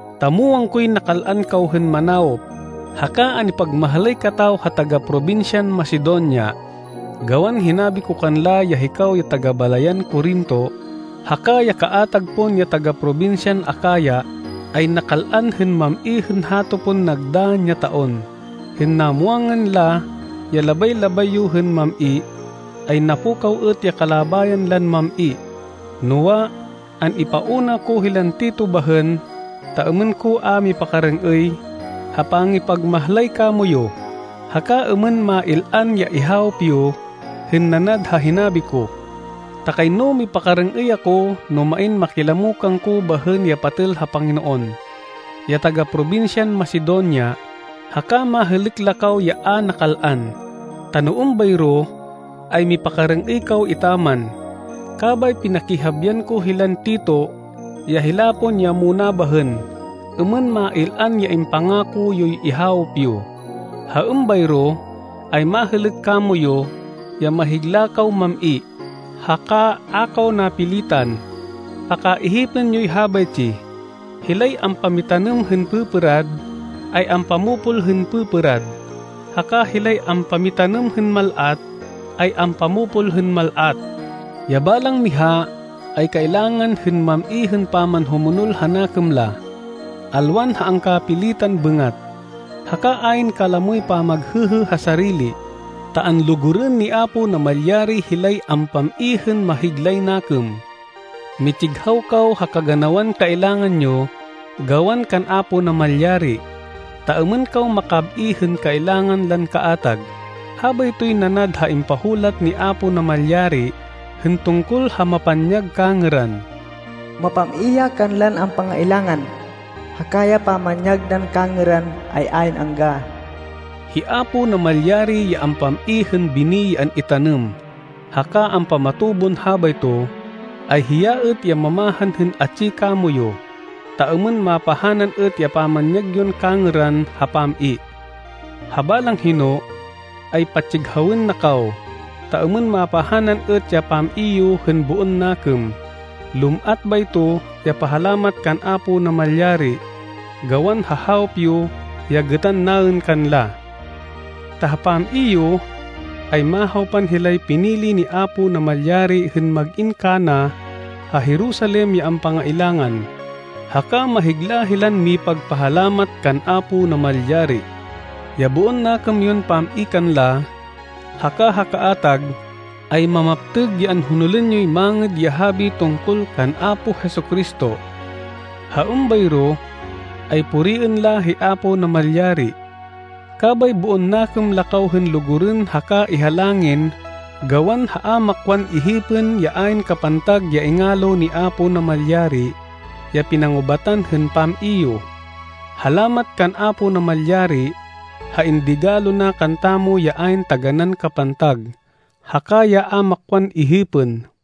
ta muwang koy nakal-an kaw hên manawop, haka an-ipagmahlay kataw ha taga-probinsyan Macedonia. Gawan hinabi ko kanla ya hikaw ya taga-balayan Corinto, haka ya kaatag pon ya taga-probinsyan Acaya, ay nakal-an hên mam-i hên hato pon nagdann ya taon. Hên namwangan la ya labay-labay yo hên mam-i, ay napukaw êt ya kalabayan lan mam-i. Noa, an-ipauna ko hilan Tito bahên, ta êmên ko a mipakarêng-êy ha pangipagmahlay kamoyu, haka êmên mail-an ya ihawop yo, hên nanad ha hinabi ko. Ta kayno mipakarêng-êy ako no main makilamo kangko bahên ya patêl ha Panginoon, ya taga-probinsyan Macedonia, haka mahêlêk la kaw ya a nakal-an. Ta no êmbayro, ay mipakarêng-êy kaw etaman. Kabay pinakihabian ko hilan Tito, ya hila pon ya muna bahên, êmên mail-an ya impangako yoy ihawop yo. Ha êmbayro, ay mahêlêk kamoyu, ya mahigla kaw mam-i, haka a kaw napilitan. Pakaihipên yoy habaytsi, hilay ampamitanêm hên pêpêrad, ay ampamopol hên pêpêrad. Haka hilay ampamitanêm hên mal-at, ay ampamopol hên mal-at. Ya balang miha ay kailangan hên mam-i hên pamanhumonol ha nakêm la, alwan ha angkapilitan bêngat, haka ayn kalamoy pamaghêhê ha sarili, ta anlugurên ni Apo Namalyari hilay ampam-i hên mahiglay nakêm. Mitsighaw kaw ha kaganawan kailangan yo gawan kan Apo Namalyari, ta êmên kaw makab-i hên kailangan lan kaatag. Habaytoy nanad ha impahulat ni Apo Namalyari hên tungkol ha mapanyag kangêran, “Mapam-i ya kanlan ampangailangan, haka ya pamanyag nan kangêran ay ayn angga.” Hi Apo Namalyari ya ampam-i hên bini ya an-itanêm, haka ampamatubon habayto, ay hiya êt ya mamahan hên atsi kamoyu, ta êmên mapahanan êt ya pamanyag yon kangêran ha pam-i. Ha balang hino, ay patsighawên na kaw, ta êmên mapahanan êt ya pam-i yo hên boon nakêm. Lum-at bayto ya pahalamat kan Apo Namalyari, gawan ha hawop yo ya gêtan naên kanla. Ta ha pam-i yo, ay mahawpan hilay pinili ni Apo Namalyari hên mag-in kana ha Jerusalem ya ampangailangan, haka mahigla hilan mipagpahalamat kan Apo Namalyari. Ya boon nakêm yon pam-i kanla, haka ha kaatag, ay mamaptêg ya anhonolên yoy Mangêd ya Habi tungkol kan Apo Jesu-Cristo. Ha êmbayro ay puriên la hi Apo Namalyari. Kabay boon nakêm la kaw hên lugurên haka ihalangin gawan ha a makwan ihipên ya ayn kapantag ya ingalo ni Apo Namalyari ya pinangubatan hên pam-i yo. Halamat kan Apo Namalyari ha indigalo na kantamo ya ayn taganán kapantag, haka ya a makwan ihipên!